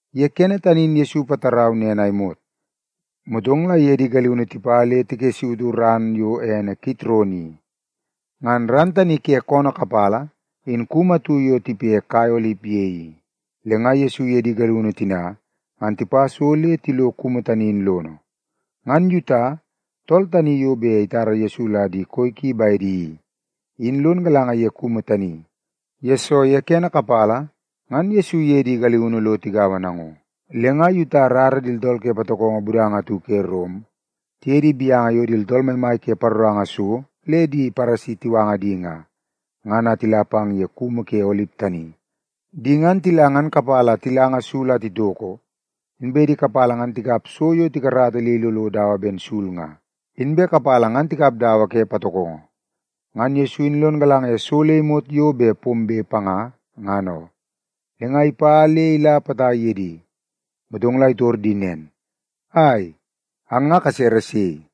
Ye kene tani in Yesu ipatarau nen a imot, motong la iye di galiunu tipa le tikessautu ran yo ene Kitron i. Ngan ran tani ke koonoo kapala in kumu atu yo tipe kai olip ye i, le nga Yesu iye di galiunu tina ngan tipa so le tilo kumu tani in lono. Ngan Yuta, tool tani yo bet itara Yesu la di koi ki bedi i, in lon galanga ye kumu tani, yesoo kene kapala, ngan Yesu iye di galiunu lo tigaua nango. Le nga Yuta irara di tooltool ke patokongo budanga atu ke Rom tiye di gaunu yo di tooltool maimai ke paroranga so le di Paresi tiwanga di nga, ngan a tila pang ye kumu ke olip tani. Di ngan tila ngan kapala tilanga sul a titoko, inbe di kapala ngan tikap so yo tikarata le ilolo dawa ben sul nga, inbe kapala ngan tikap dawa ke patokongo. Ngan Yesu in lon galanga ye so le imot yo bet pombe panga, ngan oo. Le nga ipa le ila potai ye di, motong la itor di nen, “Ai, ang nga kasere sei?”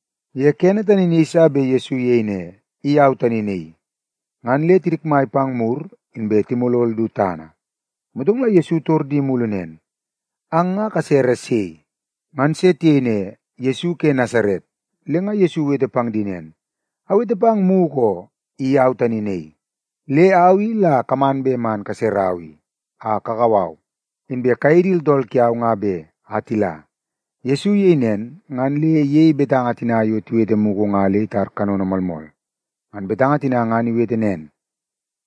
Ye kene tani in yeiso bet Yesu iyei ne, “I au tani naii,” ngan le tidikmai pang mur inbe timolol du tana. Motong la Yesu itor di mulu nen, “Ang nga kasere sei?” Ngan se tiyei ne, “Yesu ke Nasaret.” Le nga Yesu iwete pang di nen, “Awete pang mugu oo, i au tani naii. Le au i la kaman bet man kaserau i, a kakau au, inbe kayei di tooltool kiau nga be, a tila.” Yesu iyei nen, ngan le iyei betanga tina yo iwete mugu nga le itar kanono moolmool. Ngan betanga tina ngan iwete nen,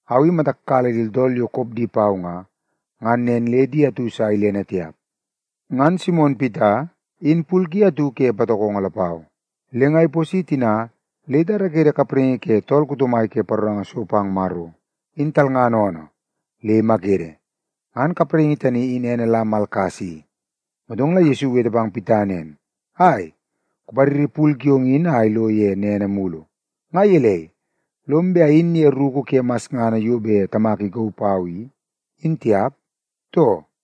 “Au i matak kala di tooltool yo kop di pau nga, ngan nen le di atu sa ilene tiap.” Ngan Simon Pita, in pul ki atu ke patokongo lapau. Le nga iposi tina le itarakede kapraingi ke tool kuto mai ke paroranga so pang Maro, in talngana oonoo, le imakede. (Ngan kapraingi tani in ene la Malkas i.) Motong la Yesu iwete pang Pita nen, “Ai, kupariri pul kiong in a ilo ye nene mulu! Nga gelei, lom bet ayin ye ruku ke masngana yo bet Tamak ikauu pau i, in tiap, too?”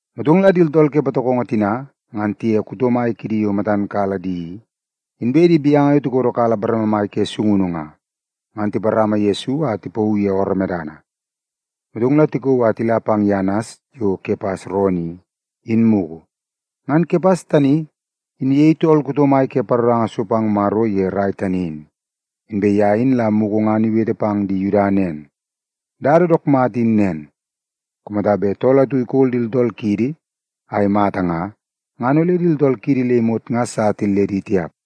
Motong la di tooltool ke patokongo tina ngan tiye kuto mai kidi yo matan kala di i, inbe di gaunu yo tikodokala bareme mai ke sungunu nga, ngan tiparama Yesu a tipauu ye ooroo medana. Motong la tikauu a tila pang ye Anas yo Kepas roonoo i, in mugu. Ngan Kepas tani, in iyei tool kuto mai ke paroranga so pang Maro ye rai tani in. Inbe ye in la mugu ngan iwete pang di Yuda nen, “Dada dook mata in nen: Kumata bet tool atu ikol di tooltool kiidi a imata nga, ngan ole di tooltool kiidi le imot nga sa tilledi tiap.”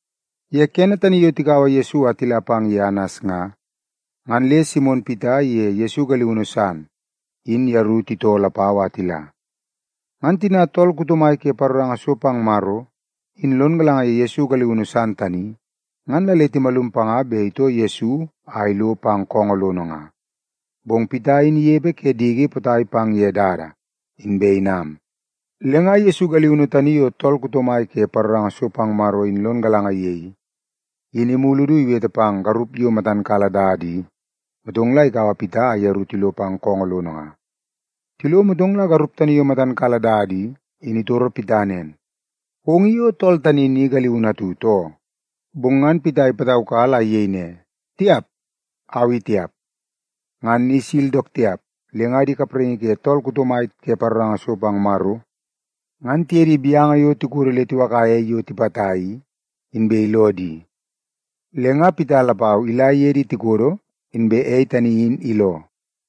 Ye kene tani yo tikaua Yesu a tila pang ye Anas nga, ngan le Simon Pita iye Yesu galiunu san, in yeru titoo lapau a tila. Ngan tina tool kuto mai ke paroranga so pang Maro, in lon galanga ye Yesu galiunu san tani, ngan la le timalum panga bet itoo Yesu a ilo pang koongoo lono nga. Bong Pita in inepe ke diki potai pang ye dada, inbe inam. Le nga Yesu galiunu tani yo tool kuto mai ke paroranga so pang Maro, in lon galanga ye i, in imulu du iwete pang garup yo matan kala dada i, motong la ikaua Pita a yeru tilo pang koongoo lono. Tilo, motong la garup tani yo matan kala dada i, in itoro Pita nen, “Ong i o tool tani ni galiunu atu, too?” Bong ngan Pita ipataukala a iyei ne, “Tiap! Au i tiap.” Ngan ni sil dook tiap, le nga di kapraingi ke tool kuto mai ke paroranga so pang Maro, ngan tiye di gaunu tikodo le tiwakaia ei yo tipata i, inbe iloo di. Le nga Pita lapau ila iye di tikodo, inbe ei tani in iloo.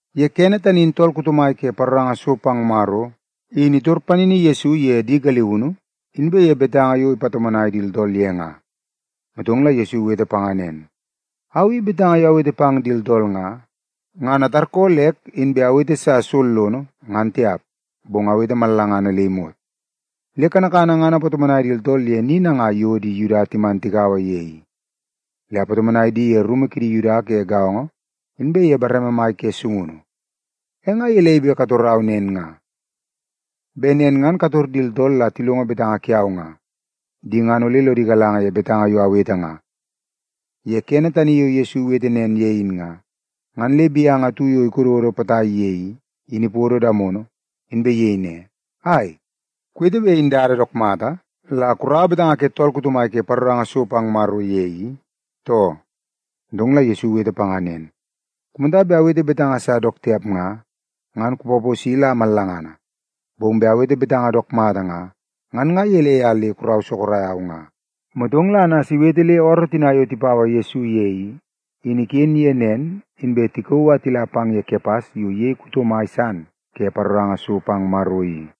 Ye kene tani in tool kuto mai ke paroranga so pang Maro, in itor panini Yesu ye di galiunu, inbe ye betanga yo ipatomonai di tooltool ye nga. Motong la Yesu iwete panga nen, “Au i betanga yo awete pang di tooltool nga, ngan atarkoolek inbe awete sa sollono, ngan tiap, bong awete mallangana le imot. Le kanakana ngan apatomonai di tooltool ye ni nangai yo di Yuda timan tigaua ye i. Le apatomonai di ye rumu kidi Yuda ke gaongo, inbe ye bareme mai ke sungunu. E nga gelei bet kutorau nen nga? Bet nen ngan kutor di tooltool la tilongo betanga kiau nga. Di ngan ole lodi galanga ye betanga yo awete nga.” Ye kene tani yo Yesu iwete nen ye in nga, ngan le gaunu atu yo ikododo potai ye i, in ipodo damono, inbe iyei ne, “Ai, kuwete bet in dada dook mata la kuraua betanga ke tool kuto mai ke paroranga so pang Maro ye i, too?” Motong la Yesu iwete panga nen, “Kumata bet awete betanga sa dook tiap nga, ngan kupaposi la mallangana. Bong bet awete betanga dook mata nga, ngan nga gelei a le kurau sorok au nga?” Motong la Anas iwete le ooroo tina yo tipaua Yesu ye i, in iken ye nen, inbe tikauu a tila pang ye Kepas yo iyei tool kuto mai san ke paroranga so pang Maro i.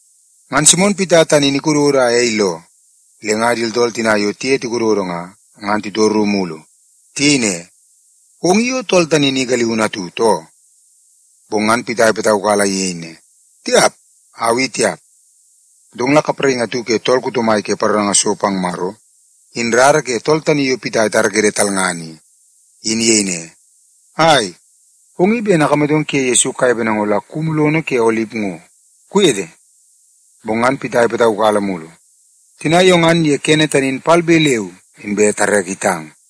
Ngan Simon Pita tani in ikododo a ei iloo. Le nga di tooltool tina yo tiye tikododo nga, ngan titoru mulu. Tiyei ne, “Ong i o tool tani ni galiunu atu, too?” Bong ngan Pita ipataukala a iyei ne, “Tiap! Au i tiap.” Motong la kapraingi atu ke tool kuto mai ke paroranga so pang Maro, in rara ke tool tani yo Pita itarakede talngana i, in iyei ne, “Ai, ong i ben akamatong kuye Yesu kanepe nango la kumu lono ke olip ngo, kuwete?” Bong ngan Pita ipataukala mulu. Tina yo ngan ye kene tani in palbe leu inbe tareke itang.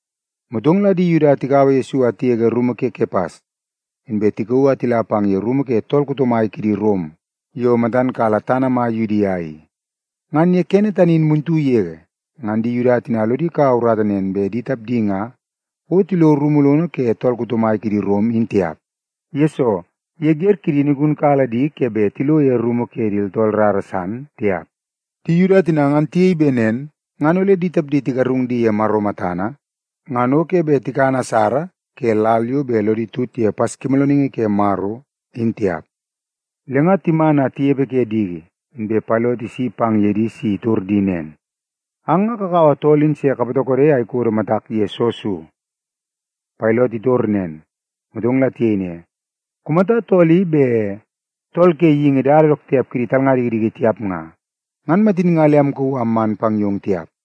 Motong la di Yuda tikaua Yesu a tigege rumu ke Kepas, inbe tikauu a tila pang ye rumu ke tool kuto mai kidi Rom yo matan kala tana mai Yudia i. Ngan ye kene tani in muntu yege, ngan di Yuda tina lodi kaua urata nen bet di tapdi nga o tilo rumu lono ke tool kuto mai kidi Rom, in tiap. Yesoo, ye wer kidi in igunkala di ke bet tilo ye rumu ke di tooltool rara san tiap. Di Yuda tina ngan tiyei bet nen ngan ole di tapdi tigarung di ye Maro matana ngan o ke bet tikan asara ke lal yo bet lodi tut ye Paskimoolooningi Ke Maro, in tiap. Le nga tinam a tinepe ke diki, inbe Pailot isi pang ye di si itor di nen, “Ang nga kakaua tool in se kapatokode a ikodo matak ye soo so?” Pailot itor nen, motong la tiyei ne, “Kumata tool i bet tool ke geingi dada dook tiap kidi talnga dikidiki tiap nga, ngan matin nga le amkauu a amman pang yong tiap.”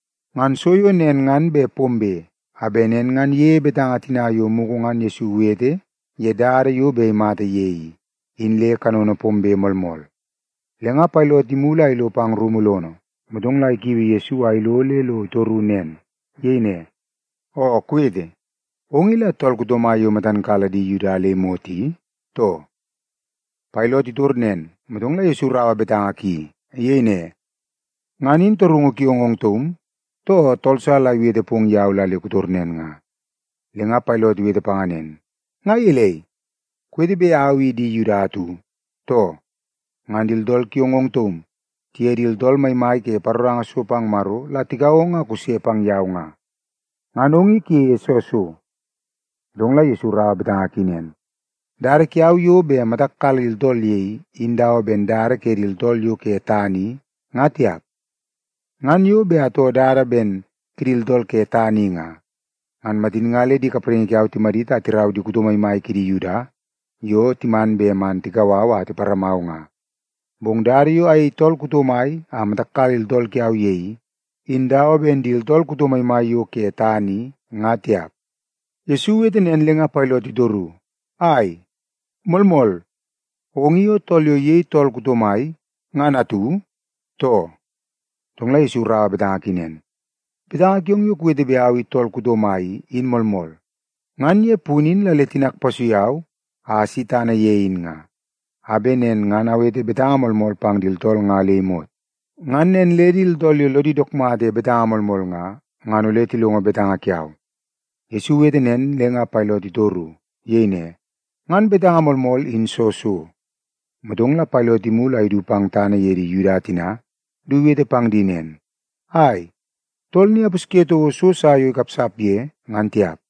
Ngan so yo nen ngan bet pombe, a bet nen ngan iyei betanga tina yo mugu ngan Yesu iwete ye dada yo bet imata ye i, in le kanono pombe moolmool. Le nga Pailot imulu a ilo pang rumu lono, motong la ikiui Yesu a ilo le lo itoru nen. Iyei ne, “Oo kuwete, ong i la tool kuto mai yo matam kala di Yuda le imot i, too?” Pailot itor nen, motong la Yesu iraua betanga ki. Iyei ne, “Ngan in torungu kiong ong taum, too tool sa la iwete pong yau la le kutor nen nga?” Le nga Pailot iwete panga nen, “Nga gelei, kuwete bet au i di Yuda atu, too? Ngan di tooltool kiong ong taum, tiye di tooltool maimai ke paroranga so pang Maro la tikau ong a kuse pang yau nga. Ngan ong i kuyeie soo so?” Motong la Yesu iraua betanga ki nen, “Dada kiau yo bet matak kala di tooltool ye i, in dawa ben dada ke di tooltool yo ke tana i, nga tiap. Ngan yo bet atoo dada ben kidi tooltool ke tana i nga, ngan matin nga le di kapraingi kiau timadit a tirau di kuto maimai kidi Yuda yo timan bet man tikau au a tiparamau nga. Bong dada yo ayei tool kuto mai a matak kala di tooltool kiau ye i, in dawa ben di tooltool kuto maimai yo ke tana i, nga tiap.” Yesu iwete nen le nga Pailot itoru, “Ai, moolmool! Ong i o tool yo iyei tool kuto mai, ngan atu, too?” Motong la Yesu iraua betanga ki nen, “Betanga kiong yo kuwete bet au i tool kuto mai i, in moolmool. Ngan ye punu in la le tinak ipasui au a asi tana ye i, a bet nen ngan awete betanga moolmool pang di tooltool nga le imot. Ngan nen le di tooltool yo lodi dook mata ye betanga moolmool nga, ngan ole tilongo betanga kiau.” Yesu iwete nen, le nga Pailot itoru. Iyei ne, “Ngan betanga moolmool, in soo so?” Motong la Pailot imulu a idu pang tana ye di Yuda tina du iwete pang di nen, “Ai, tool ni apusye toko so sa yo ikapsap ye, ngan tiap.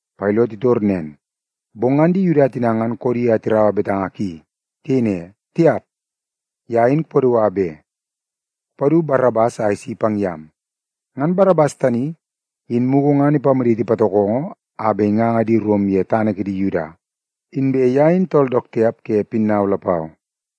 Pailot itor nen, bong ngan di Yuda tina ngan koodi a tiraua betanga ki. Tiyei ne, “Tiap, ye in kupadua be! Kupadu Barabas a isi pang yam!” Ngan Barabas tani, in mugu ngan ipamaditi patokongo a bet tinganga di Rom ye tana kidi Yuda, inbe ye in tool dook tiap ke pinnau lapau.